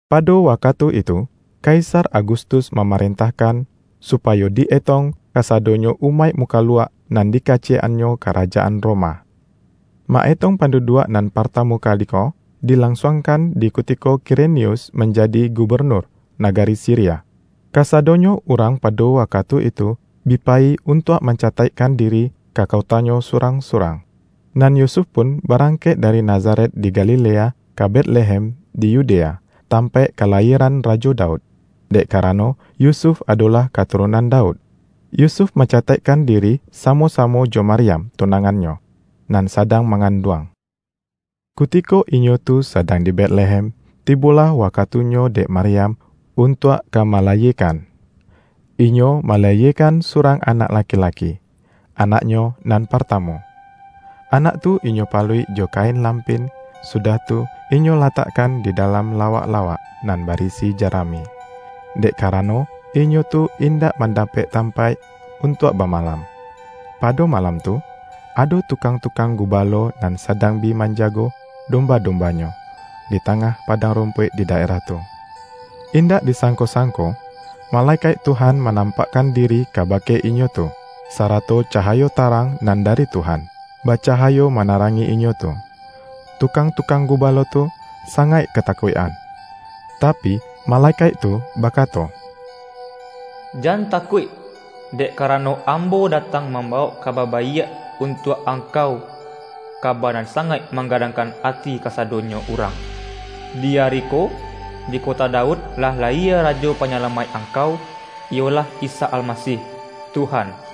Pado wakatu itu, Kaisar Agustus mamarentahkan, supayo di-etong kasadonyo umaik mukaluak, nan di ka-ciyek-annyo Karajaan Roma. Ma-etong panduduak nan partamu kali ko, di-lansuangkan di kutiko Kirenius man-jadi gubenur nagari Siria. Kasadonyo urang pado wakatu itu, bi payi un-tuak mancataikkan diri, ka kotanyo surang-surang. Nan Yusuf pun barangkek dari Na-zaret di Galilea, ka Betlehem di Yudea, tampaik kalayieran Rajo Daud; dek karano Yusuf adolah katurunan Daud. Yusuf mancataikkan diri sa-mo-samo jo Maryam tunangannyo, nan sadang manganduang. Kutiko inyo tu sadang di Betlehem, tibolah wakatunyo dek Maryam, untuak ka malayiekan. Inyo malayiekan surang anak laki-laki, anaknyo nan partamu. Anak tu inyo paluik jo kain lampin, sudah tu, inyo latakkan di dalam la-wak-lawak nan barisi jarami; dek ka-rano, inyo tu indak mandapek tam-paik untuak bamalam. Pado malam tu, ado tukang-tukang gubalo nan sadang bi manjago domba-dombanyo, di tangah padang rumpuik di daerah tu. Indak di sangko-sang-ko, malekaik Tuhan manampakkan diri kabake inyo tu, sarato cahayo ta-rang nan dari Tuhan, bacahayo ma-narangi inyo tu, tukang-tukang gu-balo tu sangaik katakuik-an. Tapi, malekaik tu bakato,”Jan takuik! Dek karano, ambo datang mambawok ka-ba baiak untuak angkau - kaba nan sangaik manggadangkan ati kasado-nyo urang. Di ari ko, di kota Daud lah layie Rajo Panyalamaik angkau, iyolah Isa Almasih, Tuhan.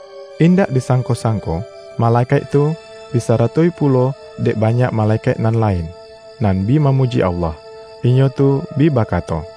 Indak disangko-sangko, malekaik tu, disaratoi pulo dek banyak male-kaik nan lain, nan bi mamuji Allah. Inyo tu bi bakato,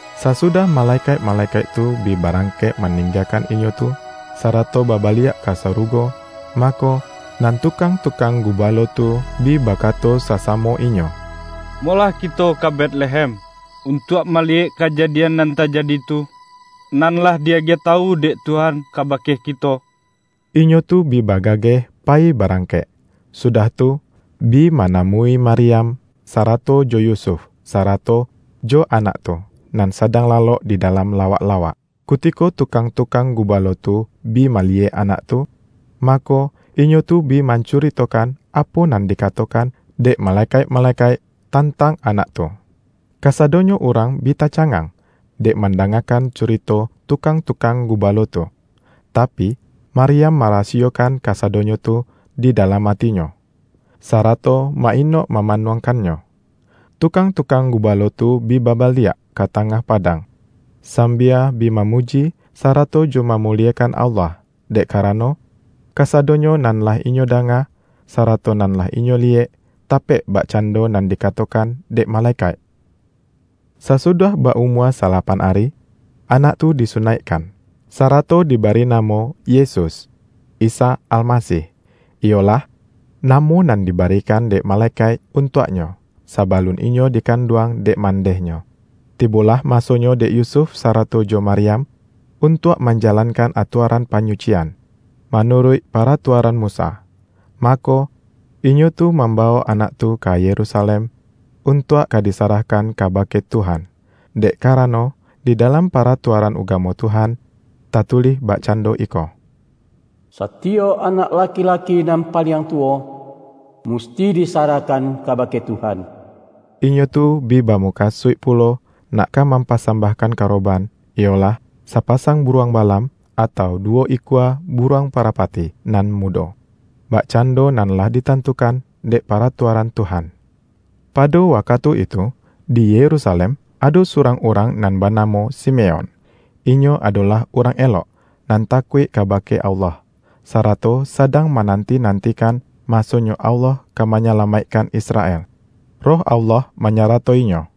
Sasudah malekaik-malekaik tu bi barangkek maninggakan inyo tu, sarato babaliak ka sarugo, mako, nan tu-kang-tukang gubalo tu, bi bakato sa-samo inyo,”Molah kito ka Betlehem, untuak maliyek kajadian nan tajadi tu, nan lah di-agiah tawu dek Tuhan kabake kito.” Inyo tu bi bagageh payi barangkek, sudah tu, bi manamui Maryam, sarato jo Yusuf, sarato jo Anak tu, nan sadang lalok di dalam lawak-lawak. Kutiko tukang-tukang gubalo tu bi maliyek Anak tu, mako, inyo tu bi mancuritokan, apo nan dikatokan dek malekaik-malekaik tantang Anak tu. Kasadonyo urang bi tacangang, dek mandangakan curito tukang-tukang gubalo tu. Tapi, Maryam marasi-yokan kasadonyo tu di dalam atinyo, sarato ma-inok mamanuangkannyo. Tukang-tukang gubalo tu bi babaliak ka tangah padang, sambia bi mamuji, sarato jo mamuliekan Allah, dek kara-no, kasadonyo nan lah inyo danga, sa-rato nan lah inyo liyek, tapek bakcan-do nan dikatokan dek malekaik. Sasudah ba-umua salapan ari, Anak tu di sunaikkan. Sarato diba-ri namo, Yesus, (Isa Almasih), iyolah, namo nan dibarikan dek malekaik un-tuak-Nyo, sabalun Inyo dikanduang dek mandeh-Nyo. Tibolah masonyo dek Yusuf sara-to jo Maryam, untuak manjalankan atuaran panyucian, manuruik para-tuaran Musa. Mako, inyo tu mamba-wok Anak tu ka Yerusalem, untuak ka disarahkan kabake Tuhan. Dek karano, di dalam Paratuaran Ugamo Tuhan, tatulih bakcando iko,”Satiyok anak laki-laki nan paliang tuwo, mus-ti disarahkan kabake Tuhan.” Inyo tu bi bamukasuik pulo, nak ka mam-pasambahkan karoban, iyolah, sapasang buruang balam, atau duwo ikua buruang parapati nan mudo, bakcan-do nan lah ditantukan dek Paratua-ran Tuhan. Pado wakatu itu, di Yerusalem ado surang urang nan banamo Sime-on. Inyo adolah urang elok, nan takuik kabake Allah, sarato sadang mananti-nantikan, masonyo Allah ka manyala-maikkan Israel. Roh Allah manyarato-inyo,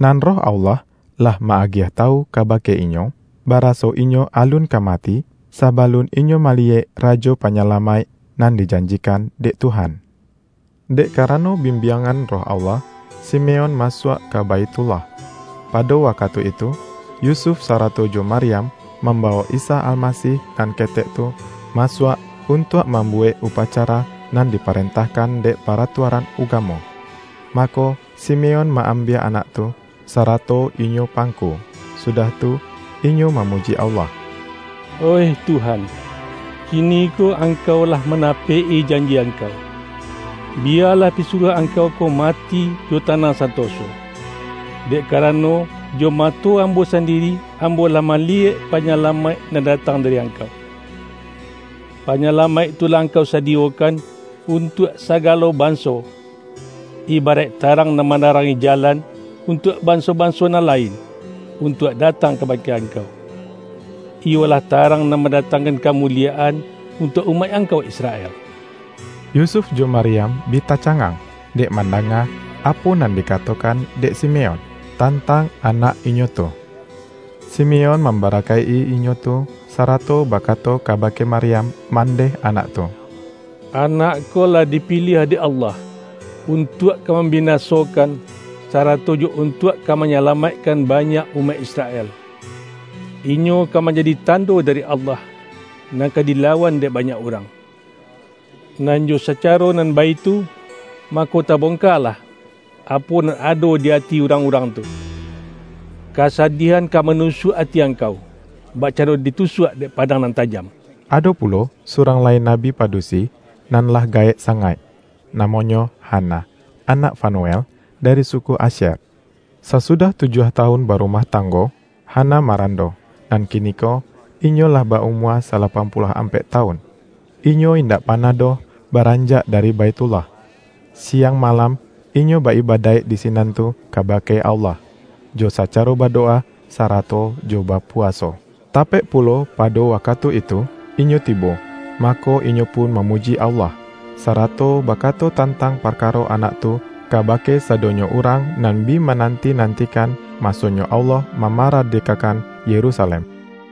nan Roh Allah, lah ma-agiah tawu kabake inyo, baraso inyo alun ka mati, sabalun inyo maliyek Rajo Pa-nyalamaik nan dijanjikan dek Tuhan. Dek karano bimbiangan Roh Allah, Simeon masuak ka Baithullah. Pado wakatu itu, Yusuf sarato jo Maryam, mambawok Isa Almasih nan ketek tu, masuak, untuak mambuwek upacara nan diparentahkan dek paratuaran ugamo. Mako, Simeon ma-ambiak Anak tu, sarato inyo pangku, sudah tu, inyo mamuji Allah, ”Oih Tuhan, kiniko Angkau lah manapek-i janji Angkau. Biyalah pisuruah Angkau ko mati jo tanang santoso. Dek karano, jo mato ambo sandiri, ambo lah maliyek Panyalamaik nan datang dari Angkau. Panyalamaik tu lah Angkau sadiyokan, untuak sagalo banso: ibaraik tarang nan manarangi jalan, untuak banso-banso nan lain, untuak datang kabake Angkau; iyolah tarang nan mandatangkan kamuliyaan, untuak umaik Angkau Israel.” Yusuf jo Maryam bi tacangang, dek mandanga apo nan dikatokan dek Si-meon, tantang Anak inyo tu. Simeon mambarakaik-i inyo tu, sarato baka-to kabake Maryam, mandeh Anak tu,”Anak ko lah dipiliah dek Allah, untuak ka mambinasokan, sarato jo untuak ka manyalamaikkan banyak umaik Israel. Inyo ka manjadi tando dari Allah, nan ka dilawan dek banyak urang, nan jo sacaro nan baitu, mako tabongka-lah, apo nan ado di ati urang-urang tu. Kasadiahan ka manusuak ati ang-kau, bakcando ditusuak dek padang nan tajam.” Ado pulo surang lai nabi padusi, nan lah gaek sangaik. Namonyo Ha-na, anak Fanuel, dari suku Asyer. Sa-sudah tujuah tawun barumah tanggo, Hana marando, nan kiniko inyo lah ba-umua salapan puluah ampek ta-wun. Inyo indak panah doh baranjak dari Baithullah. Siang malam inyo ba-ibadaik di sinan tu kabake Allah, jo sacaro badowa, sarato jo bapuwaso. Tapek pulo pado wakatu itu, inyo tibo, mako inyo pun mamuji Allah, sa-rato bakato tantang parkaro Anak tu, kabake sadonyo urang nan bi manan-ti-nantikan, masonyo Allah mamara-dekakan Yerusalem.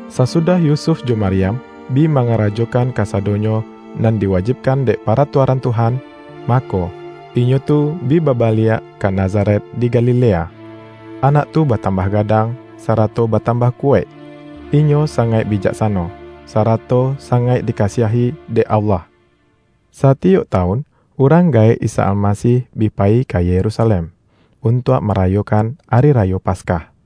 Sasudah Yusuf jo Maryam, bi ma-ngarajokan kasadonyo nan diwajibkan dek Paratuaran Tuhan, mako, inyo tu bi babaliak ka Nazaret di Galilea. Anak tu batambah gadang, sarato batambah kuwaik. Inyo sangaik bijaksano, sara-to sangaik dikasiahi dek Allah. Satiyok tawun urang gaek Isa Almasih bi payi ka Yerusalem, un-tuak marayokan Ari Rayo Paskah.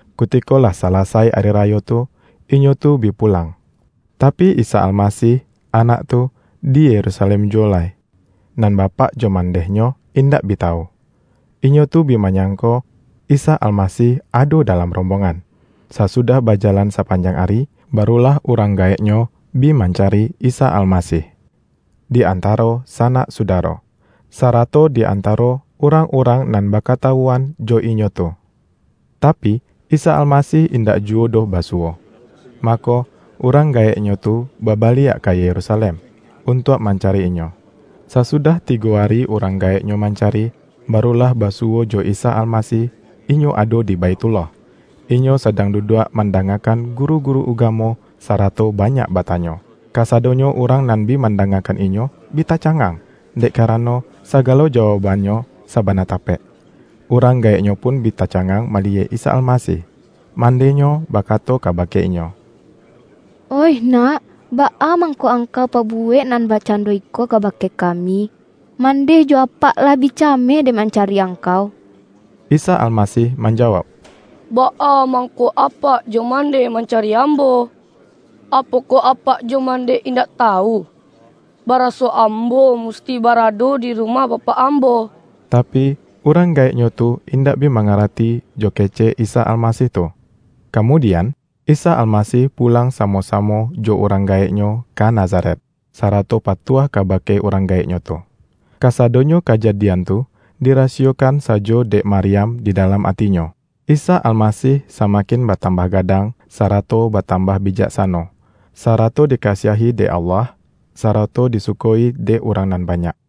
Kuti-ko lah salasai Ari Rayo tu, inyo tu bi pulang, tapi, Isa Almasih, Anak tu, di Yerusalem juwo lai, nan ba-pak jo mandeh-Nyo, indak bi tawu. inyo tu bi manyangko, Isa Almasih ado dalam rombongan. Sasudah bajalan sapanjang ari, barulah urang gaek-Nyo bi mancari Isa Almasih, di antaro sanak sudaro, sarato di an-taro urang-urang nan bakatawuan jo inyo tu. Tapi, Isa Almasih in-dak juwo doh basuwo, mako, urang gaek-Nyo tu babaliak ka Yerusalem, untuak mancari Inyo. Sasudah ti-go ari urang gaek-Nyo mancari, ba-rulah basuwo jo Isa Almasih, Inyo ado di Baithullah. Inyo sadang du-duak mandangakan guru-guru uga-mo, sarato banyak batanyo. Kasa-donyo urang nan bi mandangakan Inyo, bi tacangang, dek karano, sa-galo jawaukban-Nyo sabana tapek. Urang gaek-Nyo pun bi tacangang maliyek Isa Almasih. Mandeh-Nyo bakato kabake Inyo,”Oih Nak, baa mangko Angkau pabuwek nan bak-cando iko kabake kami? Mandeh jo apak, lah bi cameh dek manca-ri Angkau!” Isa Almasih manjawauk,”Baa mangko apak jo mandeh mancari Ambo? Apokoh apak jo mandeh in-dak tawu, baraso Ambo musti bara-do di rumah Bapak Ambo?” Tapi, urang gaek-Nyo tu indak bi manga-rati jo kecek Isa Almasih tu. Kamudian, Isa Almasih pulang samo-samo jo urang gaek-Nyo ka Na-zaret, sarato patuah kabake urang gaek-Nyo tu. Kasadonyo kajadian tu, dirasiyokan sajo dek Maryam di dalam atinyo. Isa Almasih sama-kin batambah gadang, sarato batam-bah bijaksano, sarato dikasiahi dek Allah, sarato disuko-i dek urang nan banyak.